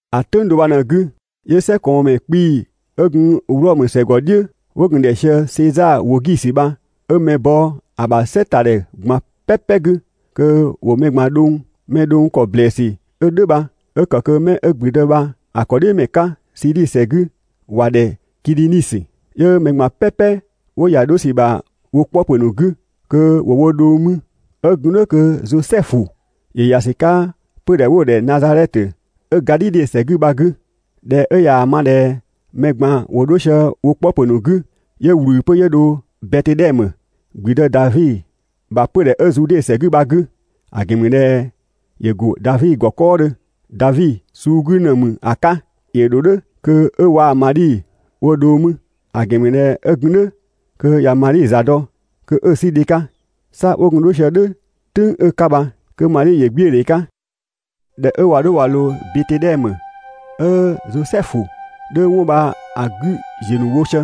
‑A "tʋ̈ng do bha ꞊në‑ 'gü 'yö "sɛkɔɔnmɛ 'kpii‑ 'ö gun Wlɔmö ‑sɛ ‑gɔ "dhiʋ̈ 'wo gun‑ ‑dhɛ sië Sezaa Wogisi bha 'ö mɛ bɔ ‑a ‑bha "sɛ ‑ta ‑dhɛ ꞊gban "pɛpɛ 'gü kö ‑wo mɛ ꞊gban dhʋng. Mɛ dhʋng ‑kɔ ‑blɛɛsü 'ö "dhʋ̈ bha 'ö ‑kë kö 'mɛ 'ö ‑gblüdë bha‑ ‑kɔdhiʋ̈mɛ 'ka Siidhi ‑sɛ 'gü ‑wa ‑dhɛ Kidhinisö. 'Yö mɛ ꞊gban "pɛpɛ 'wo ‑ya 'dho ‑sü ‑bha wo 'kpɔpö ‑nu 'gü kö ‑wo wo dhʋng mü. 'Ö gun "dhʋ̈ kö Zosɛfu ‑yö ‑ya ‑sü 'ka 'pödhɛ 'wo‑ ‑dhɛ Nazadhɛtö 'ö Gadhidhe ‑sɛ 'gü bha‑ 'gü. ꞊Dhɛ 'ö ꞊yaa‑ ma ꞊dhɛ mɛ ꞊gban ‑wo 'dho sië wo 'kpɔpö ‑nu 'gü, 'yö ꞊wlü 'pö 'yö dho Betedhɛmö, ‑gblüdë Davi ‑bha 'pödhɛ 'ö Zude ‑sɛ 'gü bha‑ 'gü; ‑a ‑gɛn ‑mü ꞊dhɛ ‑yö go Davi ‑gɔ 'kɔɔdhö, Davi suu 'gü ‑në ‑mü ‑a 'ka. ‑Yö ‑dho "dhʋ̈ kö 'ö waa‑ Madhi wo dhʋng mü, ‑a ‑gɛn ‑mü ꞊dhɛ 'ö gun "dhʋ̈ kö ꞊ya Madhi ‑za dɔ kö 'ö‑ 'sü dhe 'ka. 'Sa 'wo gun 'dho sië‑ "dhʋ̈ "tʋ̈ng 'ö‑ 'ka bha kö Madhi ‑yö 'gbiödhe 'ka. ꞊Dhɛ 'ö ꞊wa 'dho ꞊wa ꞊loo Betedhɛmö, 'ö Zosɛfu 'dhö 'wɔn bha‑ 'gü ‑ziö ‑nu wo sië,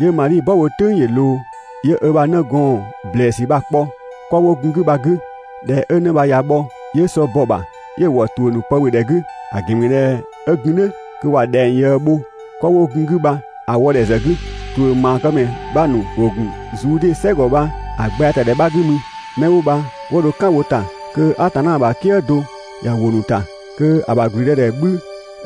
'yö Madhi "bɔ bho "tʋ̈ng ‑yö ꞊loo. 'Yö ö ‑bha 'nëgɔɔn ‑blɛɛsü bha‑ kpɔ 'kɔ 'wo gun‑ 'gü bha‑ 'gü. ꞊Dhɛ 'ö 'në bha ꞊ya bhɔ, 'yö sɔ bɔ‑ ‑bha 'yö‑ ‑wɔ ‑tuʋ̈ ‑nu pë ‑bhö ‑dhɛ 'gü; ‑a ‑gɛn ‑mü ꞊dhɛ 'ö gun "dhʋ̈ kö ꞊wa ‑dhɛng ꞊yëë bho 'kɔ 'wo gun‑ 'gü bha‑ wɔdhɛ ‑zë 'gü. ‑Tuʋ̈ ‑maakëmɛ 'bha ‑nu ‑wo ‑gun Zude "sɛgɔ bha‑ gbɛɛtadhɛ 'bha 'gü mü. 'Mɛ 'wo bha 'wo dho "kan wo ‑ta kö Atanna ‑bha "kië do ꞊ya ‑wo ‑nu ‑ta kö‑ ‑bha ‑gblüdëdhɛ 'bhü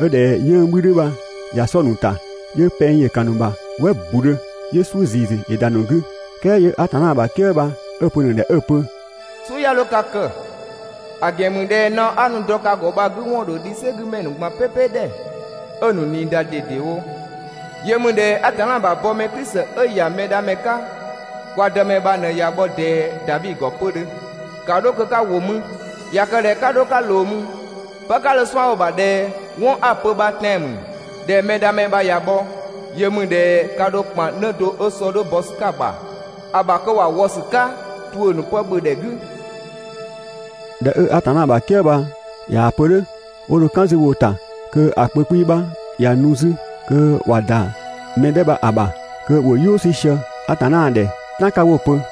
'ö ꞊dhɛ 'yënng‑ 'bhü 'dhö bha ꞊ya 'sɔ‑ ‑nu ‑ta, 'yö pɛng ‑yö ‑kan ‑nu ‑bha "wɛ ‑budhö, 'yö "suʋ̈ ‑ziisü ‑yö ‑da ‑nu 'gü. "Kɛɛ 'yö Atanna ‑bha "kië bha 'ö‑ pö‑ ‑nu ‑dhɛ 'ö‑ pö: «"Suʋ̈ 'ya 'dho ka kë, ‑a ‑gɛn ‑mü ꞊dhɛ naɔ 'a nu‑ dɔ ka ‑gɔ bha‑ 'gü ‑wɔn ‑dho dhi "sɛgümɛ ‑nu ꞊gban "pɛpɛ ‑dhɛ 'ö‑ ‑nu ꞊nii ‑da ꞊dedewo. Yö ‑mü ꞊dhɛ Atanna ‑bha bɔmɛ Klisi 'ö‑ ‑ya Mɛdhamɛ 'ka, kwa Dëmɛ bha ꞊në ꞊ya bhɔ ꞊dɛɛ Davi ‑gɔ 'pödhö. (‑Ka 'dho kö 'ka ‑wo mü), ꞊ya kë ꞊dhɛ 'ka 'dho 'ka ꞊loo mü, pë 'ka dho‑ 'suan‑ bho‑ ‑bha ꞊dhɛ 'wɔn 'a‑ pö bha tɛan‑ ‑mü, ꞊dhɛ Mɛdhamɛ bha ꞊ya bhɔ, yö ‑mü ꞊dhɛ ka ‑dho ‑kpan 'në do 'ö sɔ 'dhö bɔ ‑sü 'ka‑ ‑bha ‑a ‑bha kö ‑wa wɔ ‑sü 'ka ‑tuʋ̈ ‑nu pë ‑bhö ‑dhɛ 'gü.» ꞊Dhɛ 'ö Atanna ‑bha "kië bha ꞊yaa‑ pö "dhʋ̈, 'wo dho "kan 'zü wo ‑ta kö‑ kpö 'kpii‑ 'bha ꞊ya nu 'zü kö ꞊wa ‑da mɛ 'dhɛ bha‑ ‑bha kö ‑wo "yʋʋ 'sü sië Atanna ‑dhɛ ("tan 'ka) 'wo‑ pö: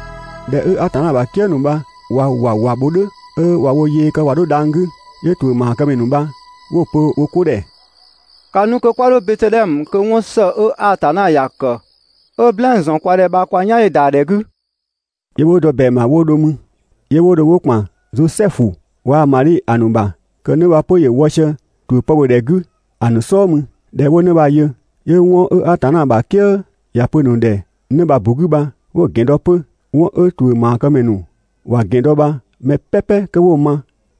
꞊Dhɛ 'ö Atanna ‑bha "kië ‑nu bha ꞊wa ‑wawa bho "dhʋ̈ 'ö ꞊wa wo yee kë ꞊wa 'dho dhang‑ 'gü, 'yö ‑tuʋ̈ ‑maakëmɛ ‑nu bha 'wo‑ pö wo 'ko ‑dhɛ: «‑Ka nu kö 'kwa 'dho Betedhɛmö kö 'wɔn ‑së 'ö Atanna ‑ya ‑kë 'ö‑ "blɛɛn‑ ‑zɔn kwa ‑dhɛ bha kwa "yan ‑yö ‑da ‑dhɛ 'gü!» 'Yö 'wo dɔ ‑bɛang ‑bha 'wo dho 'mü. 'Yö 'wo dho 'wo ‑kpan Zosɛfu waa‑ Madhi ‑a ‑nu ‑bha kö 'në bha 'pö ‑yö wɔ sië ‑tuʋ̈ pë ‑bhö ‑dhɛ 'gü ‑a ‑nu "sɔɔ mü. ꞊Dhɛ 'wo 'në bha‑ yö, 'yö 'wɔn 'ö Atanna ‑bha "kië ‑ya pö‑ ‑nu ‑dhɛ 'në bha‑ ‑bu 'gü bha 'wo‑ ‑gɛn dɔ 'pö. 'Wɔn 'ö ‑tuʋ̈ ‑maakëmɛ ‑nu ‑wa ‑gɛn dɔ bha mɛ "pɛpɛ 'kö 'wo‑ ma,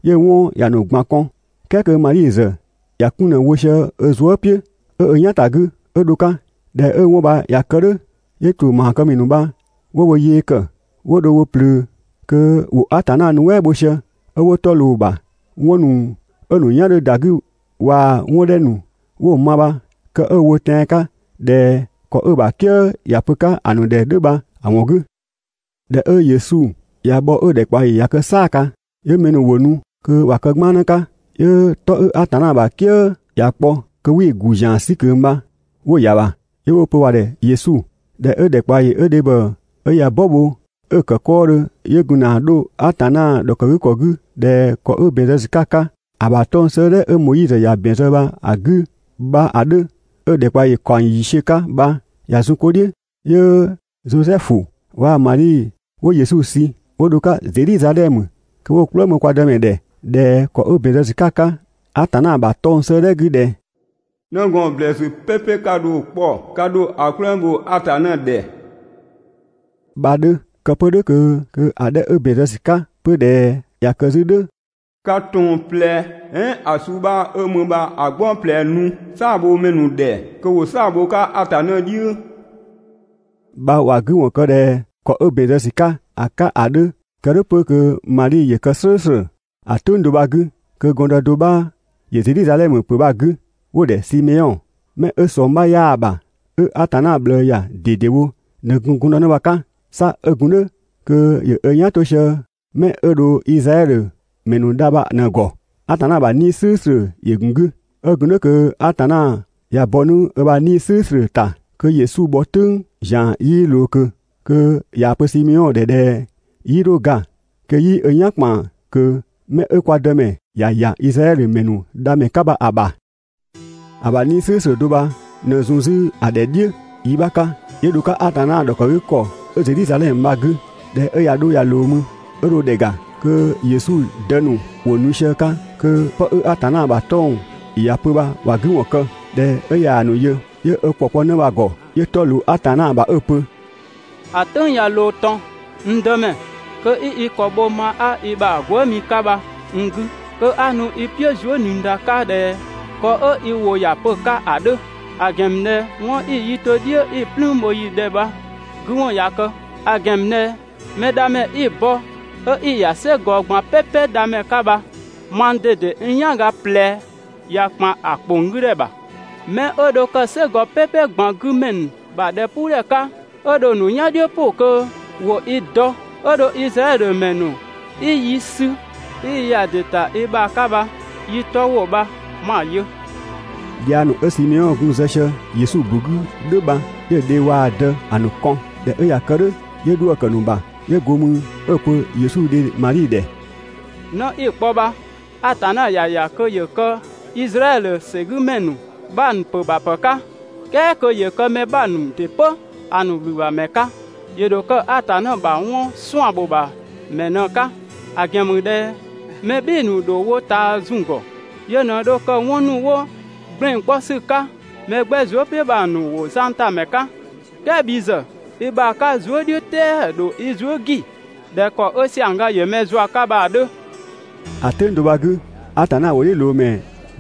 'yö‑ 'wɔn ‑ya ‑nu ꞊gban kɔn, "kɛɛ kö Madhi ‑zë ‑ya 'kun ꞊në wo sië ö zuë" "piʋ̈ 'ö ö "yan ‑ta 'gü 'ö dho‑ 'ka. ꞊Dhɛ 'ö 'wɔn bha ꞊ya kë "dhʋ̈, 'yö ‑tuʋ̈ ‑maakëmɛ ‑nu bha 'wo wo yee ‑kë 'wo dho wo ꞊plöö kö ‑wo Atanna nuɛ" bho sië 'ö 'wo 'tɔ ꞊loo‑ ‑bha 'wɔn ‑nu 'ö‑ ‑nu "yan 'dhö ‑da 'gü waa‑ 'dhɛ ‑nu 'wo‑ ma bha kë 'ö‑ wo tɛan‑ 'ka ꞊dhɛ ‑kɔ 'ö‑ ‑bha "kië ‑ya pö 'ka‑ ‑nu ‑dhɛ ‑a 'dhö bha‑ ‑wɔn 'gü. ꞊Dhɛ 'ö Yesu ꞊ya bhɔ 'ö‑ ‑dhɛkpaɔyi ꞊ya kë "saaga, 'yö mɛ ‑nu ‑wo nu kö ‑wa kë 'gbannë 'ka. 'Yö‑ 'tɔ 'ö Atanna ‑bha "kië ‑ya kpɔ kö 'wii‑ ‑gu ‑zian 'sü ꞊kö bha 'wo‑ ‑ya ‑bha, 'yö 'wo‑ pö ‑wa ‑dhɛ Yesu. ꞊Dhɛ 'ö ‑dhɛkpaɔyi 'ö dhebhɔ 'ö ꞊ya "bɔ bho 'ö‑ ‑kë 'kɔɔdhö 'yö gun ‑na 'dho Atanna ‑dhɔkëgükɔ 'gü ꞊dhɛ ‑kɔ 'ö ‑bɛn zë ‑sü 'ka‑ 'ka ‑a ‑bha 'tɔng‑ 'sëëdhɛ 'ö Moizö ‑ya ‑bɛn zë bha‑ 'gü bha‑ 'dhö, 'ö‑ ‑dhɛkpaɔyi ‑kaɔng ‑yiisiö 'ka bha ꞊ya zun 'ko "dhiʋ̈, 'yö Zosɛfu waa‑ Madhi 'wo Yesu sü 'wo dho‑ 'ka Zedhizadhɛmö kö 'wo‑ "kplëng bho kwa Dëmɛ ‑dhɛ ꞊dhɛ ‑kɔ 'ö ‑bɛn zë ‑sü 'ka‑ 'ka Atanna ‑bha 'tɔng‑ 'sëëdhɛ 'gü ꞊dhɛ: «'Nëgɔɔn ‑blɛɛsü "pɛpɛ 'ka dho‑ 'kpɔ, ka ‑dho ‑a "kplëng bho Atanna ‑dhɛ» bha‑ 'dhö. Kë 'pö "dhʋ̈ kö‑ 'dhɛ 'ö ‑bɛn zë ‑sü 'ka 'pö ꞊dhɛ ꞊ya kë 'zü "dhʋ̈: «'Ka ‑tong ꞊plɛ "ɛɛn ‑a suu 'bha 'ö mü bha‑ "gbɔng ꞊plɛ nu "saabhomɛ ‑nu ‑dhɛ kö ‑wo "saa‑ bho‑ 'ka Atanna "dhiʋ̈» bha ‑wa 'gü ‑wɔn kë ꞊dhɛ ‑kɔ 'ö ‑bɛn zë ‑sü 'ka‑ 'ka ‑a 'dhö (kë "dhʋ̈ 'pö kö Madhi ‑yö kë "slʋ̈ʋ̈slʋ̈). ‑A "tʋ̈ng do bha‑ 'gü kö gɔndë do 'bha ‑yö Zedhizadhɛmö ‑pö bha‑ 'gü 'wo‑ ‑dhɛ Simeɔn. 'Mɛ 'ö ꞊sɔng 'bha 'yaa‑ ‑bha, 'ö Atanna ꞊bhlëë ‑ya ꞊dedewo ꞊në gun gɔndënë bha‑ 'ka. 'Sa 'ö gun "dhʋ̈ kö ‑yö ö "yan 'to sië 'mɛ 'ö dho Izraɛdhö ‑mɛ ‑nu dha bha ꞊në‑ ‑gɔ. Atanna ‑bha 'Nii‑ "slʋ̈ʋ̈slʋ̈ ‑yö ‑gun 'gü. 'Ö gun "dhʋ̈ kö Atanna ꞊ya bɔ 'nu ö bha 'Nii‑ "slʋ̈ʋ̈slʋ̈ ‑ta kö Yesu bhɔ "tʋ̈ng ‑zian 'yii ꞊loo ꞊kö kö ꞊yaa‑ pö Simeɔn ‑dhɛ ꞊dhɛ 'yii 'dho ga kö 'yii ö "yan ‑kpan ꞊kö 'mɛ 'ö kwa Dëmɛ ‑ya ‑ya Izraɛdhö ‑mɛ ‑nu Dhamɛ 'ka bha‑ ‑bha. ‑A ‑bha 'Nii‑ "slʋ̈ʋ̈slʋ̈ do bha ꞊në zun 'zü‑ ‑dhɛ "dhiʋ̈ 'yi bha‑ 'ka 'yö dho‑ 'ka Atanna ‑dhɔkëgükɔ 'ö Zedhizadhɛmö bha‑ 'gü. ꞊Dhɛ 'ö ꞊ya 'dho ꞊ya ꞊loo mü, 'ö dho ‑dhɛ ‑ga kö Yesu dë ‑nu ‑wo nu sië‑ 'ka kö 'pë 'ö Atanna ‑bha 'tɔng‑ ‑ya pö bha ‑wa 'gü ‑wɔn kë. ꞊Dhɛ 'ö ꞊yaa‑ ‑nu yö, 'yö ö ‑kɔ kpɔ 'në bha‑ ‑gɔ 'yö 'tɔ ꞊loo Atanna ‑bha 'ö‑ pö: «‑A "tʋ̈ng ꞊ya ꞊loo ꞊tɔn, n Dëmɛ, kö 'i i ‑kɔ bho ma 'a i ‑bha gwëëmi 'ka bha n 'gü, kö 'a nu i "piʋ̈ zuëniida 'ka ꞊dhɛ ‑kɔ 'ö i ‑wʋ ‑ya pö‑ 'ka ‑a 'dhö; ‑a ‑gɛn ‑mü ꞊dhɛ 'wɔn 'i‑ yi to "dhiʋ̈ 'i‑ "plüün bho yi ‑dhɛ bha‑ 'gü ‑wɔn ꞊ya kë. ‑A ‑gɛn ‑mü ꞊dhɛ Mɛdhamɛ 'i‑ bɔ 'ö 'i‑ ‑ya "sɛgɔ ꞊gban "pɛpɛ Dhamɛ 'ka bha, mang ꞊dede n "yanga ꞊plɛ ꞊ya ‑kpan ‑a ‑kponggüdhɛ ‑bha. 'Mɛ 'ö dho kë "sɛgɔ "pɛpɛ ꞊gban 'gü ‑mɛ ‑nu ‑bha ‑dhɛpuudhɛ 'ka, 'ö dho‑ ‑nu "yan "dhiʋ̈ "pʋ kö ‑wo i dɔ, 'ö dho Izraɛdhö ‑mɛ ‑nu 'i yi sü 'i yi ‑ya ‑dɩ ‑ta i ‑bha 'ka bha yi 'tɔ ‑wo bha 'ma‑ yö.» Dhiang ‑nu 'ö Simeɔn gun‑ zë sië Yesu ‑bu 'gü "dhʋ̈ bha, ‑ya dhe waa‑ dë ‑a ‑nu ‑kɔn. ꞊Dhɛ 'ö ꞊ya kë "dhʋ̈, 'yö 'dhuë‑ ‑kë ‑nu ‑bha, 'yö go mü 'ö‑ pö Yesu dhe Madhi ‑dhɛ: «'Në 'i‑ kpɔ bha, Atanna ‑ya ‑ya kö ‑yö kë Izraɛdhö ‑sɛgümɛ ‑nu 'bha ‑nu ‑pö ‑bha ‑pë 'ka, "kɛɛ kö ‑yö kë mɛ 'bha ‑nu ‑dɩ 'pö ‑a ‑nu ‑wlübhamɛ 'ka. ‑Yö ‑dho kë Atanna ‑bha 'wɔn 'suan‑ ‑bho ‑bha ‑mɛ ꞊në‑ 'ka; ‑a ‑gɛn ‑mü ꞊dhɛ mɛ "bhɩɩ‑ ‑nu ‑dho wo ꞊taa zun‑ ‑gɔ. Yö ꞊në dho kë 'wɔn ‑nu 'wo ‑gblɛn 'kpɔ ‑sü 'ka mɛ 'gbɛ zuë" "piʋ̈ bha‑ ‑nu ‑wo zangtamɛ 'ka. "Kɛɛ bhi ‑zë, i ‑bha 'ka zuë" "dhiʋ̈ "tɛɛ‑ ‑dho i zuë" ‑gi ꞊dhɛ ‑kɔ 'ö ‑siangga ‑yö mɛ zua 'ka bha‑ 'dhö.» ‑A "tʋ̈ng do bha‑ 'gü, Atanna ‑wʋ "dhiʋ̈ ꞊loo ‑dhe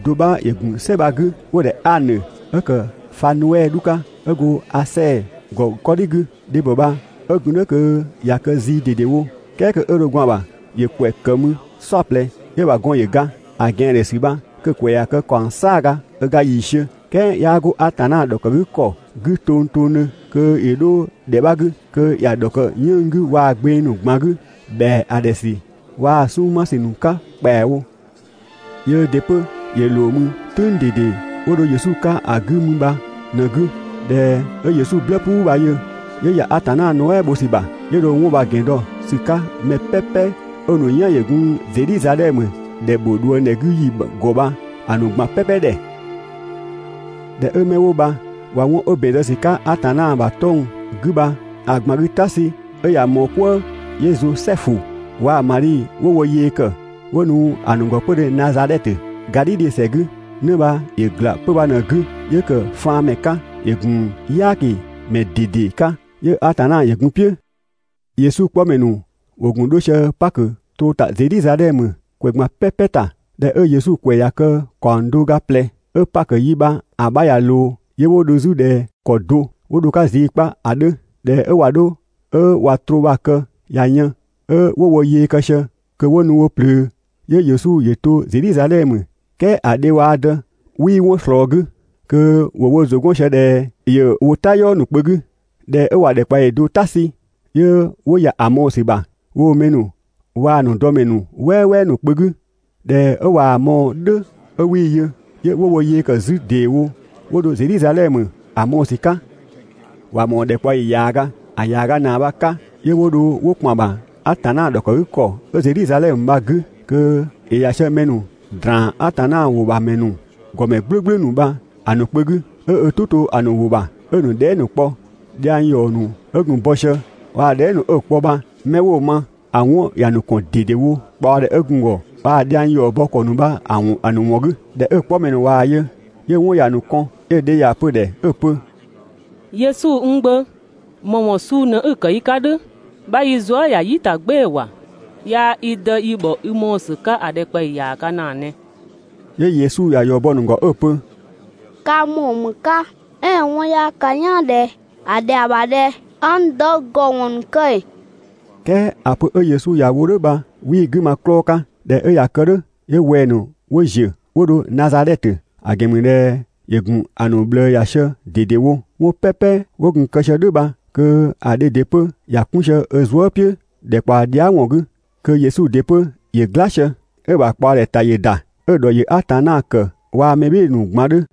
do 'bha ‑yö ‑gun "sɛ bha‑ 'gü 'wo‑ ‑dhɛ Anö, 'ö kë Fanuɛ 'dhu 'ka, 'ö go Asɛɛ ‑gɔ 'kɔdhi 'gü. Dhebhɔ bha 'ö gun "dhʋ̈ kö ꞊ya kë zii ꞊dedewo, "kɛɛ kö 'ö dho gwaan‑ ‑bha ‑yö ‑kwɛ ‑kë mü "saɔplɛ, 'yö‑ ‑bha gɔn ‑yö ga. ‑A ꞊gɛandhe ‑sü bha kö‑ ‑kwɛ ꞊ya kë ‑kaɔng "saaga ö ga ‑yiisiö, "kɛɛ 'yaa 'go Atanna ‑dhɔkëgükɔ 'gü tongtongdhö kö ‑yö 'dho ‑dhɛ 'bha 'gü. Kö ‑ya ‑dhɔkë 'yënng‑ 'gü waa gbeng ‑nu ꞊gban 'gü ‑bhɛa ‑a ‑dhɛ ‑sü waa‑ 'sunng‑ 'ma ‑sü ‑nu 'ka ‑kpɛawo. Yöö ‑dɩ 'pö ‑yö ꞊loo mü "tʋ̈ng ꞊dede 'wo dho Yesu 'ka ‑a 'gü mü bha ꞊në‑ 'gü. ꞊Dhɛ 'ö Yesu "blë "puu bha‑ yö, 'yö ‑ya Atanna nuɛ" bho ‑sü ‑bha, 'yö dho‑ ‑wɔn ‑gɛn dɔ ‑sü 'ka mɛ "pɛpɛ 'ö‑ ‑nu "yan ‑yö gun Zedhizadhɛmö ‑dhɛ ‑bho ꞊dhuëngdhɛ 'gü ‑yi ‑gɔ bha‑ ‑nu ꞊gban "pɛpɛ ‑dhɛ. ꞊Dhɛ 'ö 'mɛ 'wo bha ꞊wa 'wɔn 'ö ‑bɛn zë ‑sü 'ka Atanna ‑bha 'tɔng‑ 'gü bha‑ ꞊gban 'gü "ta sü 'ö ꞊ya ꞊mɔɔ "kwëë, 'yö Zosɛfu waa‑ Madhi 'wo wo yee ‑kë 'wo nu ‑a ‑nu ‑gɔ 'pödhö Nazadhɛtö, Gadhidhe ‑sɛ 'gü. 'Në bha ‑yö ‑gla 'pö‑ bha ꞊në‑ 'gü, 'yö ‑kë faanmɛ 'ka, ‑yö ‑gun "yaakimɛ ꞊dede 'ka, 'yö Atanna ‑yö gun‑ "piʋ̈. Yesu 'kpɔmɛ ‑nu ‑wo ‑gun 'dho sië Pakö troo ‑ta Zedhizadhɛmö ‑kwɛ ꞊gban "pɛpɛ ‑ta. ꞊Dhɛ 'ö Yesu ‑kwɛ ꞊ya kë ‑kaɔng do ga ꞊plɛ 'ö Pakö yi bha‑ 'bha ꞊ya ꞊loo, 'yö 'wo dho 'zü ꞊dhɛ ‑kɔ do 'wo dho‑ 'ka zii 'kpa ‑a 'dhö. ꞊Dhɛ 'ö ꞊wa 'dho 'ö ꞊wa troo bha‑ kë ꞊ya yën, 'ö 'wo wo yee kë sië kö ‑wo nu wo ꞊plöö, 'yö Yesu ‑yö to Zedhizadhɛmö "kɛɛ ‑a dhe waa‑ dë 'wii 'wɔn ꞊slɔɔ‑ 'gü, kö ‑wo wo ‑zʋ 'gɔn sië ꞊dhɛ ‑yö wo "tayɔɔ ‑nu kpö 'gü. ꞊Dhɛ 'ö ꞊wa ‑dhɛkpaɔyi do "ta sü, 'yö 'wo ‑ya ‑a mɔɔ‑ ‑sü ‑bha woo‑ mɛ ‑nu waa‑ ‑a ‑nu dɔmɛ ‑nu "wɛɛwɛɛ ‑nu kpö 'gü. ꞊Dhɛ 'ö ꞊waa‑ mɔɔ‑ "dhʋ̈ 'ö 'wii‑ yö, 'yö 'wo wo yee ‑kë 'zü ‑deewo 'wo dho Zedhizadhɛmö ‑a mɔɔ‑ ‑sü 'ka. ‑Wa ‑mɔɔ ‑dhɛkpaɔyi ‑yaaga. ‑A ‑yaaga ‑naa bha‑ 'ka 'yö 'wo dho 'wo ‑kpan ‑bha Atanna ‑dhɔkëgükɔ 'ö Zedhizadhɛmö bha‑ 'gü, kö ‑yö ‑ya sië mɛ ‑nu ‑draan Atanna ‑wʋ ‑bha ‑mɛ ‑nu ‑gɔmɛ "gblʋ̈gblʋ̈ ‑nu bha‑ ‑nu kpö 'gü, 'ö ö "tʋ 'to‑ ‑nu ‑wʋ ‑bha 'ö‑ ‑nu dhɛɛ" ‑nu 'kpɔ. Dhiang ‑yɔ ‑nu 'ö gun‑ bɔ sië, waa‑ dhɛɛ" ‑nu 'ö‑ kpɔ bha 'mɛ 'wo‑ ma, ‑a 'wɔn ‑ya ‑nu ‑kɔn ꞊dedewo ꞊kpaɔdhɛ 'ö gun‑ ‑gɔ waa‑ dhiang ‑yɔ bɔ ‑kɔ ‑nu bha‑ ‑nu ‑wɔn 'gü. ꞊Dhɛ 'ö‑ 'kpɔmɛ ‑nu ꞊waa‑ yö, 'yö‑ 'wɔn ‑ya ‑nu kɔn. 'Yö‑ dhe ‑ya pö‑ ‑dhɛ 'ö‑ pö: «Yesu n gbö, ‑më ‑wɔn suu ꞊në 'i‑ kë yi 'ka "dhʋ̈? 'Bha yi zuë" ‑ya "yi ‑ta "gbɩɩ‑ ‑wa! Yaa‑ i dë 'yi ‑bhɔ i mɔɔ‑ ‑sü 'ka ‑a ‑dhɛkpaɔyi ‑yaaga ‑naa ꞊nɛ. 'Yö Yesu ‑ya ‑yɔ bɔ‑ ‑nu ‑gɔ 'ö‑ pö: «Ka n ‑mɔɔ ‑më 'ka? "Ɛɛn ‑a 'wɔn 'yaa ka "yaan ꞊dhɛ ‑a ‑dhɛa ‑bha ꞊dhɛ 'a n dë ‑gɔ ‑wɔn ‑nu kë ‑ee?» "Kɛɛ ‑a pö 'ö Yesu ‑ya wo "dhʋ̈ bha 'wii‑ 'gü ma‑ 'klɔɔ‑ 'ka. ꞊Dhɛ 'ö ꞊ya kë "dhʋ̈, 'yö wɛng‑ ‑nu 'wo ‑ziö 'wo dho Nazadhɛtö, ‑a ‑gɛn ‑mü ꞊dhɛ ‑yö ‑gun ‑a ‑nu ꞊bhlëë ‑ya sië ꞊dedewo. 'Wɔn "pɛpɛ 'wo gun‑ kë sië "dhʋ̈ bha kö ‑a dhe ‑dɩ 'pö ‑ya 'kun sië ö zuë" "piʋ̈ ‑dhɛkpaɔ dhia" ‑wɔn 'gü. Kö Yesu ‑dɩ 'pö ‑yö "gla sië, 'ö‑ ‑bha ꞊kpaɔdhɛ ‑ta ‑yö ‑da, 'ö‑ ‑dhɔ ‑yö Atanna ‑kë waa‑ mɛ "bhɩɩ‑ ‑nu ꞊gban 'dhö.